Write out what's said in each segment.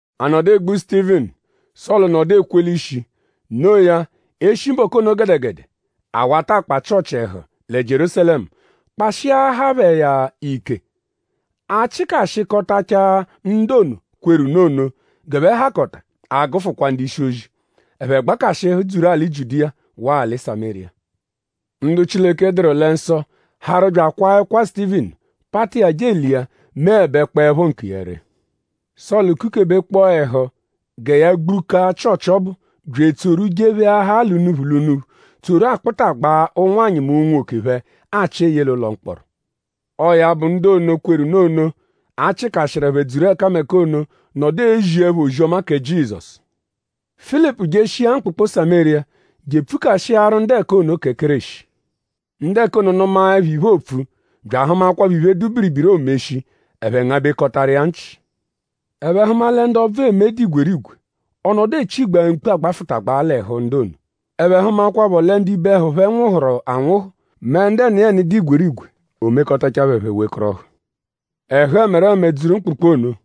A nọdu egbu Sutivinu; Sọlu nọdu ekwe l'ishi. Noo ya; e shi mbọku ono gẹdegede; a wata akpa Chịochi ẹhu lẹ Jierúsalẹmu kpashiahaa phẹ iya ike. A chịkashikotachaa ndu ono, kweru nụ ono g'ẹphe hakọta a -gụfukwa ndu-ishi-ozi. Ẹphe gbakashịhu dzuru alị Jiudiya waa alị Samériya. Ndu Chileke dụru lẹ nsọ harụ bya akwaa ẹkwa Sutivinu pata iya je elia meẹbekpoepho nkiya ree. Sọlu kukebekpọo ẹhu gẹ ya gbukaa Chịochi ọbu bya etsoru jepheahaa l'unuphu l'unuphu tsoru akpụtagbaa ụnwanyi mẹ unwoke phẹ achị eye l'ụlo mkpọro. Ọo ya bụ; ndu ono, kweru nụ ono, a chịkashiru ẹphe dzuru ẹkameka ono nọdu eziẹpho ozi-ọma kẹ Jizọsu. Filipu jeshia mkpụkpu Samériya je epfukashiaru ndu ẹka ono kẹ Kéreshi. Ndu ẹka ono nụmaepho iphe, oopfu; bya ahụmakwapho iphe, dụ biribiri, oomeshi; ẹphe ngabẹkotaru iya nchị. Ẹphe hụma lẹ ndu ọbvu eme dụ igwerigwe; ọ nọdu echigbaa mkpu agbafụtagbaa l'ẹhu ndu ono. Ẹphe hụmakwapho lẹ ndu ibe ẹhu phẹ nwụhuru anwụhu; mẹ ndu ẹniyeni dụ igwerigwe; o mekọtachaa phẹ; ẹphe wekọrohu. Ẹhu ẹmereme dzuru mkpụkpu ono.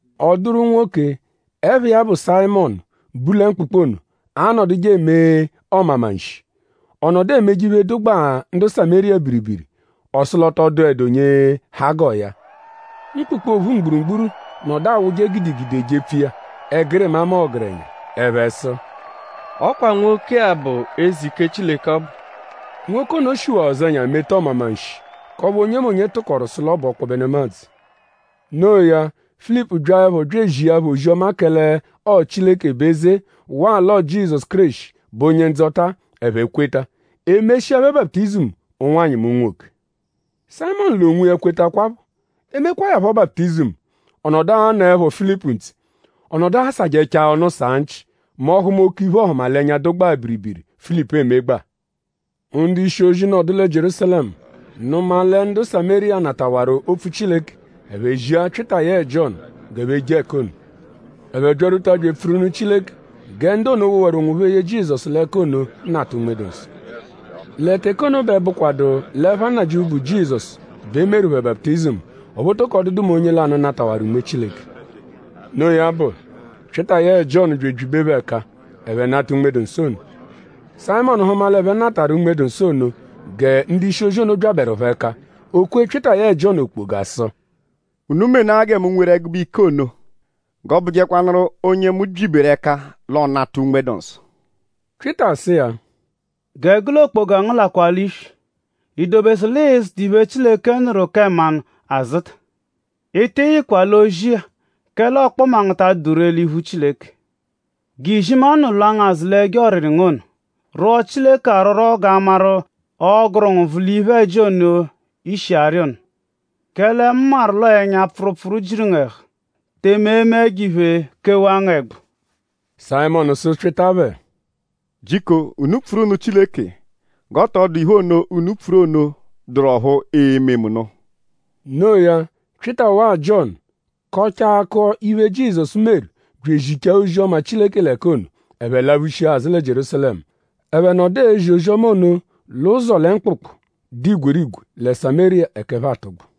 Ọ dụru nwoke, ẹpha iya bụ Sayịmonu, bu lẹ mkpụkpu ono, anọduje eme ọmamanshi. Ọ nọdu emeje iphe, dụgbaa ndu Samériya biribiri. Ọ sụ l'ọ tọ dụedu onye ha g'ọo ya. Mkpụkpu ophu mgburugburu nọdu awụje gidigidi ejepfu iya; ẹgirima mẹ ọgerenya. Ẹphe sụ: “Ọ kwa nwoke-a bụ Eze Ike Chileke ọbu.” Nwoke ono shiwaa ụzenya meta ọmamanshi k'ọphu onyemonye tụkoru sụ l'ọ bụ ọkpobe nemadzụ. No iya; Filipu byaẹpho bya ezia phẹ ozi-ọma kẹle ọo Chileke bụ eze waa l'ọo Jizọsu Kéreshi bụ Onye-Ndzọta; ẹphe kweta. E meshia phẹ baputizimu; ụnwanyi mẹ unwoke. Sayịmonu l'onwiya kwetakwaphọ. E mekwaa ya phọ baputizimu; ọ nọdu anọepho Filipu ntse. Ọ nọdu asajẹchaa ọnu saa nchị mẹ ọ -hụma oke iphe-ọhumalenya, dụgbaa biribiri, Filipu emegbaa. Ndu-ishi-ozi nọdu lẹ Jierúsalẹmu nụma lẹ ndu Samériya natawaru opfu Chileke. Ẹphe zia Pyịta yẹe Jiọnu g'ẹphe je ẹka ono. Ẹphe byarwuta bya epfuru nụ Chileke gẹ ndu ono, wowaru onwophẹ ye Jizọsu l'ẹka ono nata Unme-dụ-Nsọ. Lẹ teke ono bẹ bụkwadu l'ẹpha Nnajịuphu, bụ Jizọsu bẹ e meru phẹ baputizimu; ọphu ọ tọko dụdu mẹ onye lanụ natawaru Unme Chileke. Noo ya bụ; Pyịta yẹe Jiọnu bya ebyibe phẹ ẹka; ẹphe nata Unme-dụ-Nsọ ono. Sayịmonu hụma l'ẹphe natarụ Unme-dụ-Nsọ ono gẹ ndu-ishi-ozi ono byabẹru phẹ ẹka. O kwee Pyịta yẹe Jiọnu okpoga sụ: “Unu menaa gẹ mu nweru ẹgube ike ono g'ọo-bụjekwanuru onye mu byiberu ẹka l'ọo-nata Unme-dụ-Nsọ.” Pyịta sụ iya: “Gẹ gụ l'okpoga ngu lakwaa l'iswi!?I dobesu l'ịi-zụta iphe, Chileke nụru kẹ mmanụ azụta? Ị tị yịkwa l'ozi-a; kẹle ọkpoma ngu ta adụdu ree l'iphu Chileke. G'izimanụ lwa ngu azụ l'ẹjo ọriri ngu ono. Rwọo Chileke arwọrwo g'a maru;?ọoguru ngu nvụ l'iphe-ẹji ono, i shi arị ono? Kẹle mu maru l'ọo ẹnya-pfụrupfuru jiru ngu ẹhu; tẹme eme ẹjo-iphe kewaa ngu ẹgbu.” Sayịmonu sụ Pyịta phẹ: “Jiko unu pfuru nụ Chileke g'ọ tọ dụ iphe ono, unu pfuru ono dụru ọphu e-me mu nụ.” Noo ya; Pyịta waa Jiọnu kọchaa akọ iphe, Jizọsu meru bya ezichaa ozi-ọma Chileke l'ẹka ono; ẹphe laphushia azụ lẹ Jierúsalẹmu. Ẹphe nọdu ezi ozi-ọma ono l'ụzo lẹ mkpụkpu, dụ igwerigwe lẹ Samériya ẹka ẹphe atụgbu.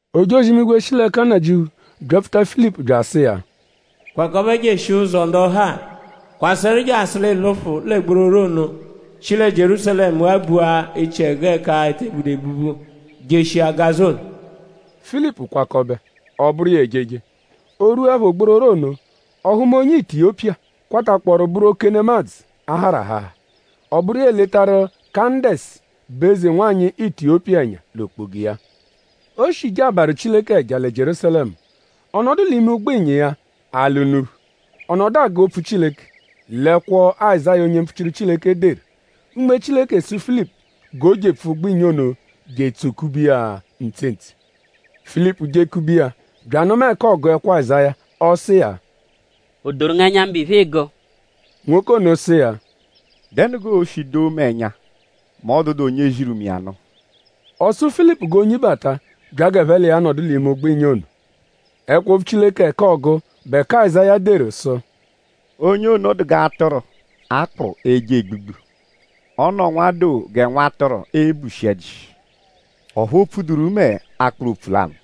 Ojozi-imigwe shi l'ẹka Nnajịuphu byapfuta Filipu bya asụ iya: “Kwakọbe jeshia ụzo ndọhali. Kwasẹru jasụ g'ị lụfu lẹ gbororo ono, shi lẹ Jierúsalẹmu ghabua echiẹgu ẹka e te budu ebubu jeshia Gaza ono.” Filipu kwakọbe; ọ bụru iya ejeje. O -rwuẹpho gbororo ono; ọ hụma onye Itiyopiya, kwatakpọoru bụru oke nemadzụ, a harụ aháhá. Ọ bụru iya eletaru Kandesi, bụ eze-nwanyị Itiyopiya ẹnya l'okpoga iya. O shi jee abarụ Chileke ẹja lẹ Jierúsalẹmu. Ọ nọdu l'ime ụgbo-ịnya iya ala unuphu. Ọ nọdu agụ opfu Chileke l'ẹkwo, Azáya onye mpfuchiru Chileke deru. Unme Chileke sụ Filipu g'o jepfu ụgbo-ịnya ono je etsokube iya ntse ntse. Filipu jekube iya bya anụma ẹka ọogu ẹkwo Azáya. Ọ sụ iya: “?O doru ngu ẹnya; mbụ iphe, ịigu?” Nwoke ono sụ iya: “?Dẹnu g'oo-shi doo mu ẹnya mẹ ọ -dụdu onye ziru mu iya nụ?” Ọ sụ Filipu g'o nyibata bya g'ẹphe l'iya nọdu l'ime ụgbo-ịnya ono. Ẹkwo-opfu Chileke ẹka ọogu bụ ẹka Azáya deru sụ: “Onye ono dụ g'atụru, a kpụ eje egbugbu. Ọ nọ nwadoo gẹ nwatụru, eebushi ẹ́jí. Ọphu o pfuduru mẹ akpụru opfu lanụ.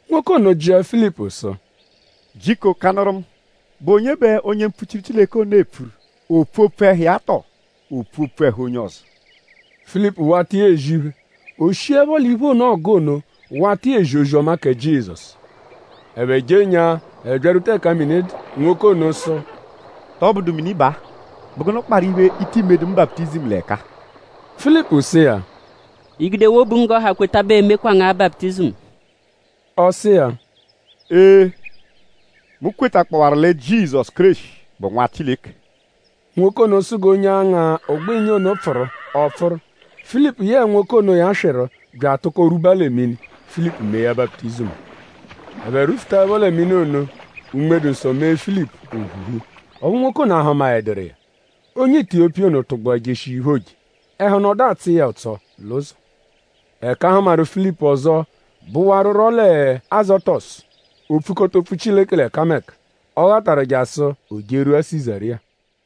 Nwoke ono jịa Filipu sụ: “Jiko kanụru mu.?Bụ onye bẹ onye mpfuchiru Chileke ono epfuru??Oopfu opfu ẹhu iya tọo oopfu opfu ẹhu onye ọzo?” Filipu wata iya ezi iphe. O shiẹpho l'iphe ono, ọogu ono wata iya ezi ozi-ọma kẹ Jizọsu. Ẹphe jenyaa ẹphe byarwuta ẹka mini dụ. Nwoke ono sụ: “?Tọbudu mini baa??Bụ gụnu kparụ iphe, i tii medu mu baputizimu l'ẹka-a?” Filipu sụ iya: “I -gudewaa obu ngu g'ọ ha kweta bẹ ee-mekwa ngu-a baputizimu.” Ọ sụ iya: “Ee! Mu kwetakpọwaru lẹ Jizọsu Kéreshi bụ Nwa Chileke.” Nwoke ono sụ g'onye anga ụgbo-ịnya ono pfụru; ọ pfụru. Filipu yẹe nwoke onoya swịru bya atụko rwuba lẹ mini. Filipu mee ya baputizimu. Ẹphe rwufutaẹpho lẹ mini ono; Unme Nnajịuphu mee Filipu o phuhu; ọphu nwoke ono ahụmaeduru iya. Onye Itiyopiya ono tụgbua jeshia iphe, ooje; ẹhu nọdu atsọ iya ụtso l'ụzo. Ẹka a hụmaru Filipu ọzo bụwaruro lẹ Azotọsu. O pfukọta opfu Chileke l'ẹkameka, ọ ghataru jasụ o jerwua Sizariya.